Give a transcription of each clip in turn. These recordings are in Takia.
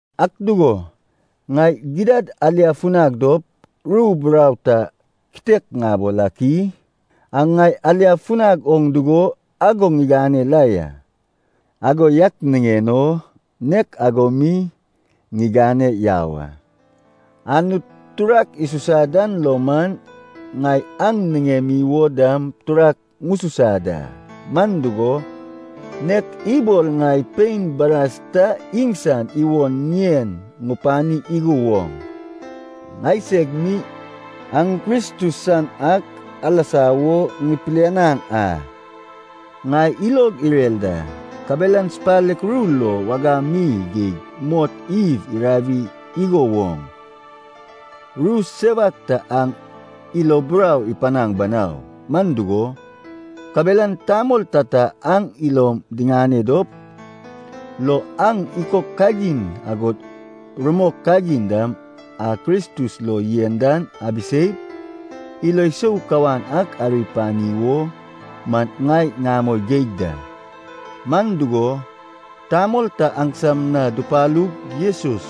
Ak dugo, ŋai gidad aliafunag dop ru burau ta kitek ŋabol ak i? (Aŋ ŋai aliafunag oŋ dugo ago ŋigane la ya, ago yak niŋen o nek ago mi ŋigane yau a.) Anut turak isusa dan lo man, ŋai aŋ niŋemi wo dam turak ŋususa da. Man dugo, nek ibol ŋai pein baras ta iŋsan iwon ŋien ŋupani igo woŋ, ŋaiseg mi aŋ Kristus san ak alasa wo ŋipilianaŋ a. Ŋai ilog irer da, kabelan supalek ru lo wagam mi geig mot Ewe irawi igo woŋ, ru sewak ta aŋ ilo burau ipanaŋ banau. Man dugo, kabelan tamol tata aŋ ilom diŋane dop lo aŋ ikok kagin agod rumok kagin dam a Kristus lo yen dan abiseip, ilo sou kawan ak ari apani wo man ŋai ŋamoi geig da. Man dugo, tamol ta aŋsam na dupalug Jesus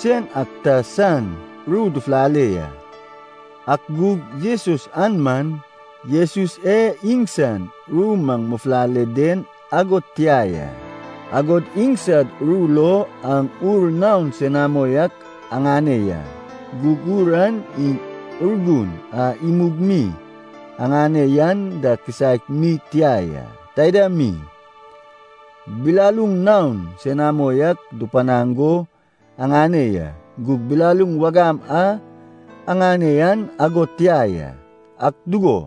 sen ak ta san ru dufulale ya, ak gug Jesus an man Jesus e iŋsan ru maŋ mufulale den ago tia ya. Agod iŋsad ru lo aŋ ur naon senamo ak aŋane ya, gug ur an iŋ Urgun a imug mi aŋane yan da kisaek mi tia ya. Taida mi, bilaluŋ naon senamo ak dupanaŋ go aŋane ya, gug bilaluŋ wagam a aŋane yan ago tia ya. Ak dugo,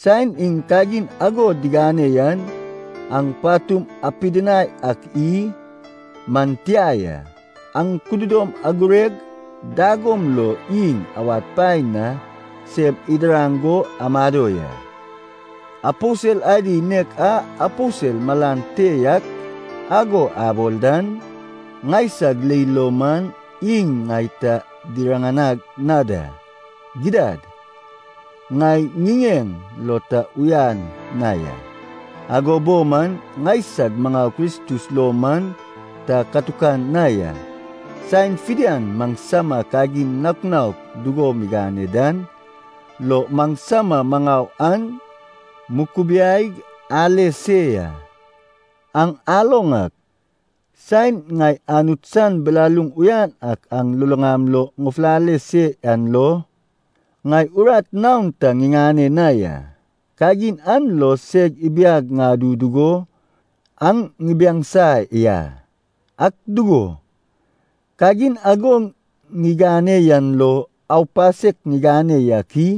saen iŋ kagin ago digane yan, aŋ patum apidinai ak i? Man tia ya, aŋ kududom agureg dagom lo iŋ awad paen na sem idiraŋ go amado ya. Aposel adi nek a “aposel malan te yak” ago abol dan, ŋaisag leil lo man iŋ ŋai ta diriŋanag na da. Gidad, ŋai ŋiŋeŋ lo ta uyan na ya, ago bo man, ŋaisag maŋau Kristus lo man ta katukan na ya. Saen fidian maŋsama kagin naok naok dugo migane dan lo maŋsama maŋau an mukubiaig ale se ya. Aŋ aloŋ ak, saen ŋai Anut san bilaluŋ uyan ak aŋ luluŋam lo ŋufulale se yan lo, ŋai urat naon ta ŋiŋane na ya. Kagin an lo seg ibiag ŋadu dugo aŋ ŋibiaŋsa ya. Ak dugo, kagin ago ŋigane yan lo aupasek ŋigane yak i?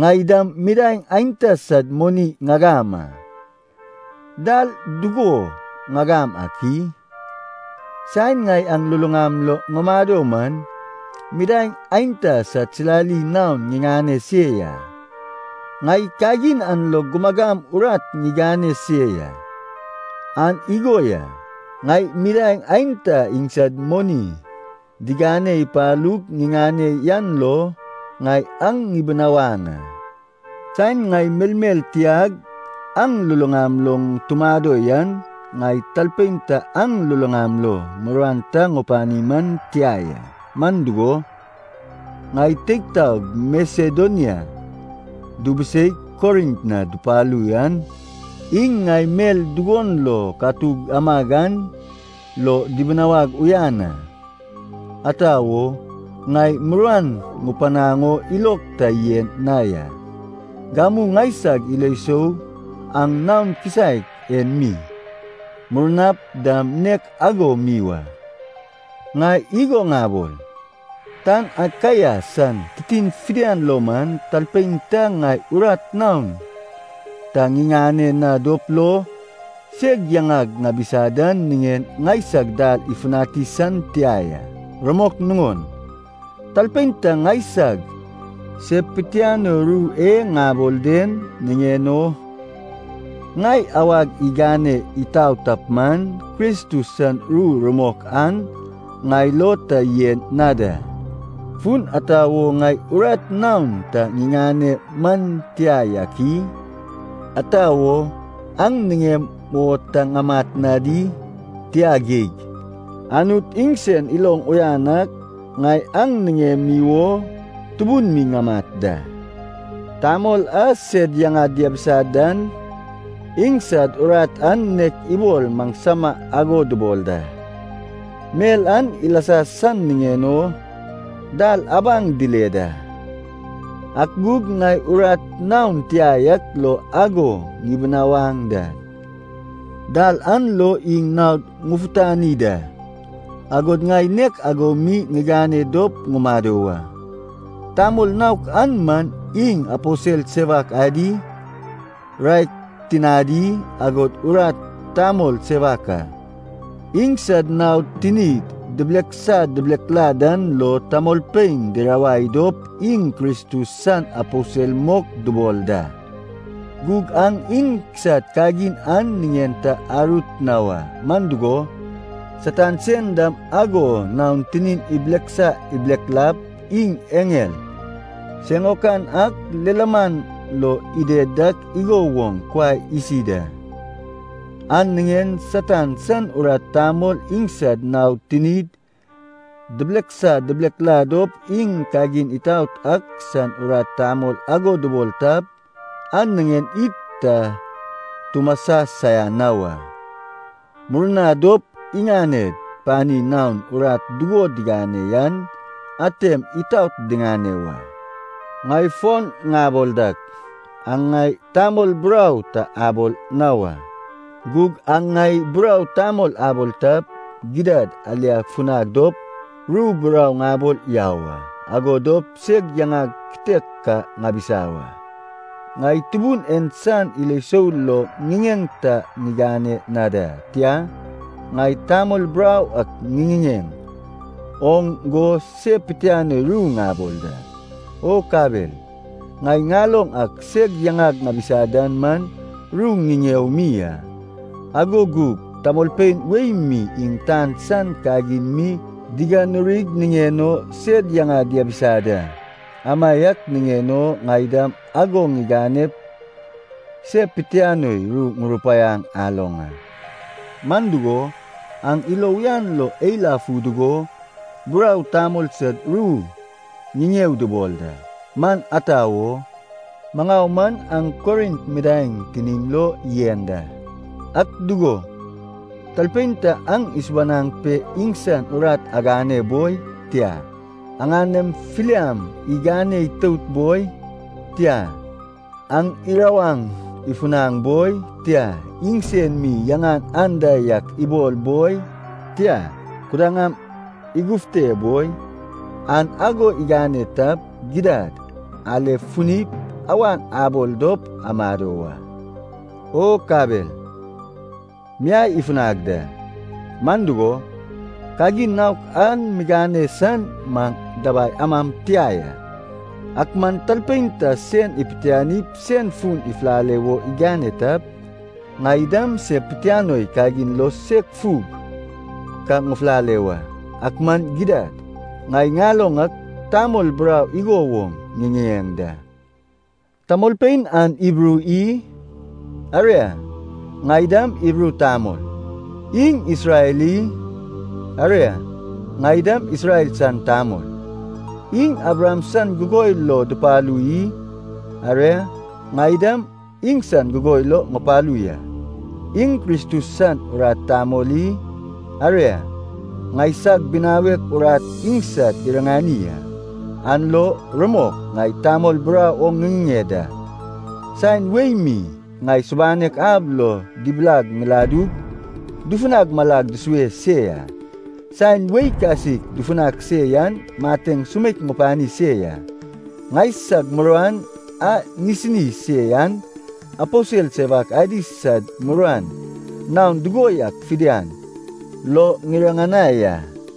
Ŋai dam midaeŋ aenta sad moni ŋagam a. Dal dugo ŋagam ak i? Saeŋ ŋai aŋ luluŋam lo ŋumado man, midaeŋ aenta sad silali naon ŋiŋane se ya. Ŋai kagin an lo gumagam urat ŋigane se ya. An igo ya, ŋai midaeŋ aenta iŋsad moni digane ipalug ŋiŋane yan lo ŋai aŋ ŋibinawaŋ a. Saen ŋai melmel tiag aŋ luluŋam lo tumado yan, ŋai talpein ta aŋ luluŋam lo muruan ta ŋupani man tia ya. Man dugo, ŋai teig taog Masedonia dubuseig Korint na dupalu yan iŋ ŋai mel dugon lo katuk amag an lo dibinawag uyan a. Ata wo? Ŋai muruan ŋupanaŋ o ilog ta yen na ya. Gamu ŋaisag ilo sou an naon kisaek en mi, murnap dam nek ago mi wa. Ŋai igo ŋabol, tan Akaia san titin fidian lo man, talpein ta ŋai urat naon ta ŋiŋane na dop lo, seg yaŋag ŋabisa dan niŋen ŋaisag dal ifutani san tia ya. Rumok nuŋon, talpein ta ŋaisag se pitianoi ru e ŋabol den niŋen o ŋai awag igane itau tap man, Kristus san ru rumok an ŋai lo ta yen na da! Fun ata wo ŋai urat naon ta ŋiŋane man tia yak i? Ata wo, aŋ niŋem o ta ŋamat na di? Tia geig. Anut iŋsen iloŋ uyan ak, ŋai aŋ niŋemi wo tubun mi ŋamat da. Tamol a sed yaŋad diabisa dan, iŋsad urat an nek ibol maŋsama ago dubol da. Mel an ilasa san niŋen o dal abaŋ dile da. Ak gug ŋai urat naon tia yak lo ago ŋibinawaŋ dan, dal an lo iŋ naod ŋufutani da. Agod ŋai nek ago mi ŋigane dop ŋumado wa. Tamol naok an man iŋ aposel sewak adi, raek tinadi, agod urat tamol sewak a. Iŋsad naod tinid dibileksa dibilekla dan lo tamolpein dirawai dop iŋ Kristus san aposel mok dubol da. Gug aŋ iŋsad kagin an niŋen ta arut na wa. Man dugo, Satan sen dam ago naon tinin ibileksa ibileklap iŋ eŋel siŋaokan ak lilaman lo ided dak igo woŋ kuai isi da. An niŋen Satan san urat tamol iŋsad naod tinid dibileksa dibilekla dop iŋ kagin itaot ak san urat tamol ago dubol tap, an niŋen id ta tumasa saian na wa. Murna dop iŋaned pani naon urat dugo digane yan atem itaot diŋane wa. Ŋai fon ŋabol dak, aŋ ŋai tamol burau ta abol na wa. Gug aŋ ŋai burau tamol abol tap, gidad aliafunag dop ru burau ŋabol yau a, ago dop seg yaŋag kitek ka ŋabisa wa. Ŋai Tubun en san ilo sou lo ŋiŋeŋ ta ŋigane na da. Tia, ŋai tamol burau ak ŋiŋiŋeŋ oŋ go se pitianoi ru ŋabol da. O kabel, ŋai ŋaloŋ ak seg yaŋag ŋabisa dan man ru ŋiŋeo mi a. Ago gug tamolpein wei mi iŋ tan san kagin mi diganurig niŋen o sed yaŋad diabisa da, amaiak niŋen o ŋai dam ago ŋiganep se pitianoi ru ŋurupaiaŋ aloŋ a. Man dugo, aŋ ilo uyan lo eilafu dugo burau tamol sad ru ŋiŋeo dubol da. Man ata wo? Maŋau man aŋ Korint midaeŋ tinim lo yen da! Ak dugo, talpein ta aŋ isubanaŋ pe iŋsan urat agane boi, tia, aŋanem filiam igane itout boi, tia, aŋ irawaŋ ifunaŋ boi, tia, iŋsen mi yaŋan anda yak ibol boi, tia, kudaŋam igufte boi, an ago igane tap, gidad alefunip awan abol dop amado wa. O kabel miai ifunag da. Man dugo, kagin naok an migane san maŋ dabai ama tia ya. Ak man talpein ta sen ipitianip sen fun ifulale wo igane tap, ŋai dam se pitianoi kagin lo seg fug ka ŋufulale wa. Ak man gidad, ŋai ŋaloŋ ak tamol burau igo woŋ ŋiŋiŋeŋ da. Tamolpein an Hibru i? Aria, ŋai dam Hibru tamol. Iŋ Isrel i? Aria, ŋai dam Isrel san tamol. Iŋ Abraham san gugoi lo dupalu i? Aria, ŋai dam iŋsan gugoi lo ŋupalu ya. Iŋ Kristus san urat tamol i? Aria, ŋaisag binawek urat iŋsad iriŋani a. (An lo, rumok, ŋai tamol burau oŋ ŋiŋiŋeŋ da.) Saen wei mi ŋai subanek ab lo dibilag ŋiladug dufunag malag dusue se ya. Saen wei kasik dufunag se yan mateŋ sumeik ŋupani se ya. Ŋaisag muruan a ŋisini se yan aposel sewak adi sad muruan naon dugo yak fidian lo ŋiriŋanai a.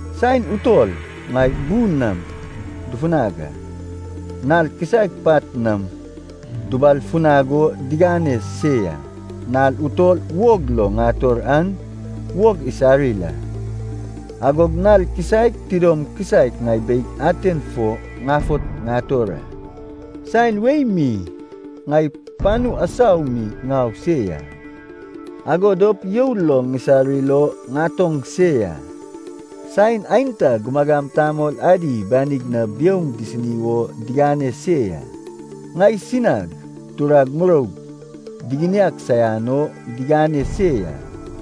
Saen utol ŋai bu nam dufunag a. Nal kisaek pat nam dubal funag o digane se ya. Nal utol wog lo ŋator an wog isarir a, agog nal kisaek tidom kisaek ŋai beig aten fo ŋafot ŋator a. Saen wei mi ŋai panu asau mi ŋau se ya, ago dop you lo ŋisarir o ŋatoŋ se ya. Saen aenta gumagam tamol adi banig na biouŋ disini wo digane se ya. Ŋaisinag turag muroug diginiag saian o digane se ya,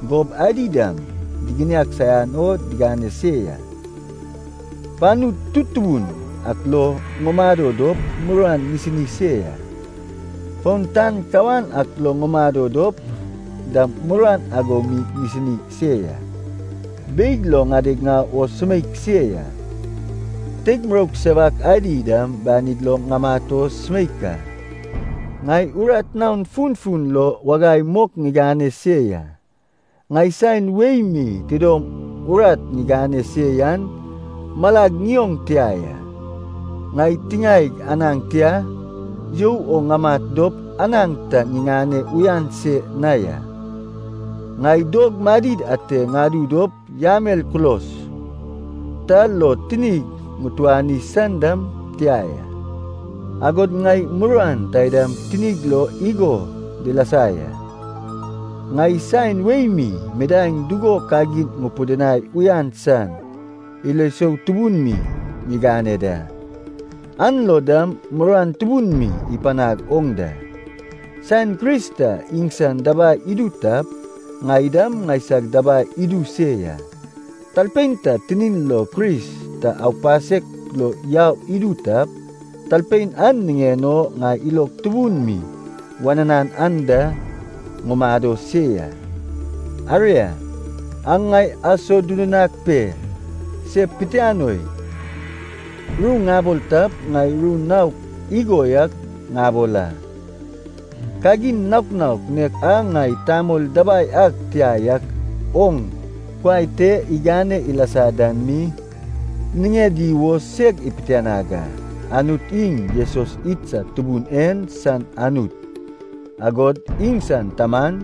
gob adi dam diginiag saian o digane se ya. Panu tutubun ak lo ŋumado dop muruan ŋisini se ya, fon tan kawan ak lo ŋumado dop dam muruan ago mi ŋisini se ya. Beig lo ŋadeg o sumeik se ya. Teig muroug sewak adi dam banid lo ŋamat o sumeik a. Ŋai urat naok funfun lo wagai mok ŋigane se ya. Ŋai saen wei mi tidom urat ŋigane se yan malag ŋioŋ tia ya. Ŋai tiŋaeg anaŋ tia you o ŋamat dop anaŋ ta ŋiŋane uyan se na ya. Ŋai dog madid ate ŋadu dop yamel kulos ta lo tinig ŋutuani san dam tia ya. Agod ŋai muruan taidam tinig lo igo dilasa ya. Ŋai saen wei mi midaeŋ dugo kagin ŋupidinai uyan san ilo sou tubun mi ŋigane da, an lo dam muruan tubun mi ipanag oŋ da. Saen Kris ta iŋsan dabai idu tap, ŋai dam ŋaisag dabai idu se ya. Talpein ta tinin lo Kris ta aupasek lo yau idu tap, talpein an niŋen o ŋai ilog tubun mi wananan anda ŋumado se ya. Aria, aŋ ŋai asodudunag pe se pitianoi ru ŋabol tap, ŋai ru naok igo yak ŋabol a. Kagin naok naok nek a ŋai tamol dabai ag tia yak oŋ kuai te igane ilasa dan mi, niŋedi wo seg ipitianag a. Anut iŋ Jesus idsad Tubun en san Anut, agod iŋsan Taman,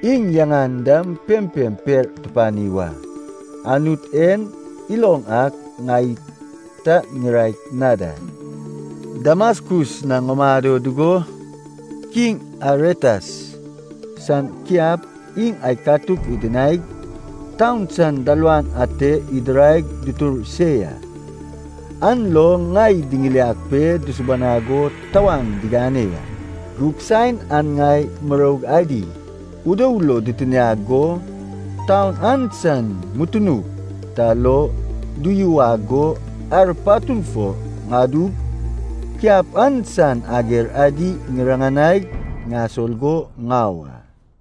iŋ yaŋan dam pempem per tupani wa. Anut en iloŋ ak ŋai ta ŋiraek na da. Damaskus na ŋumado dugo Kiŋ Aretas san kiap iŋ aikatuk idinaig taun san dalawan ate idiraig dutur se ya, an lo ŋai diŋiliag pe dusubanag o tawaŋ digane ya. Gug saen an ŋai muroug adi udou lo ditiniag go, taun an san mutunuk ta lo duyuwag go ar patun fo ŋadug, kiap an san ager adi ŋiriŋanaig ŋasol go ŋau a.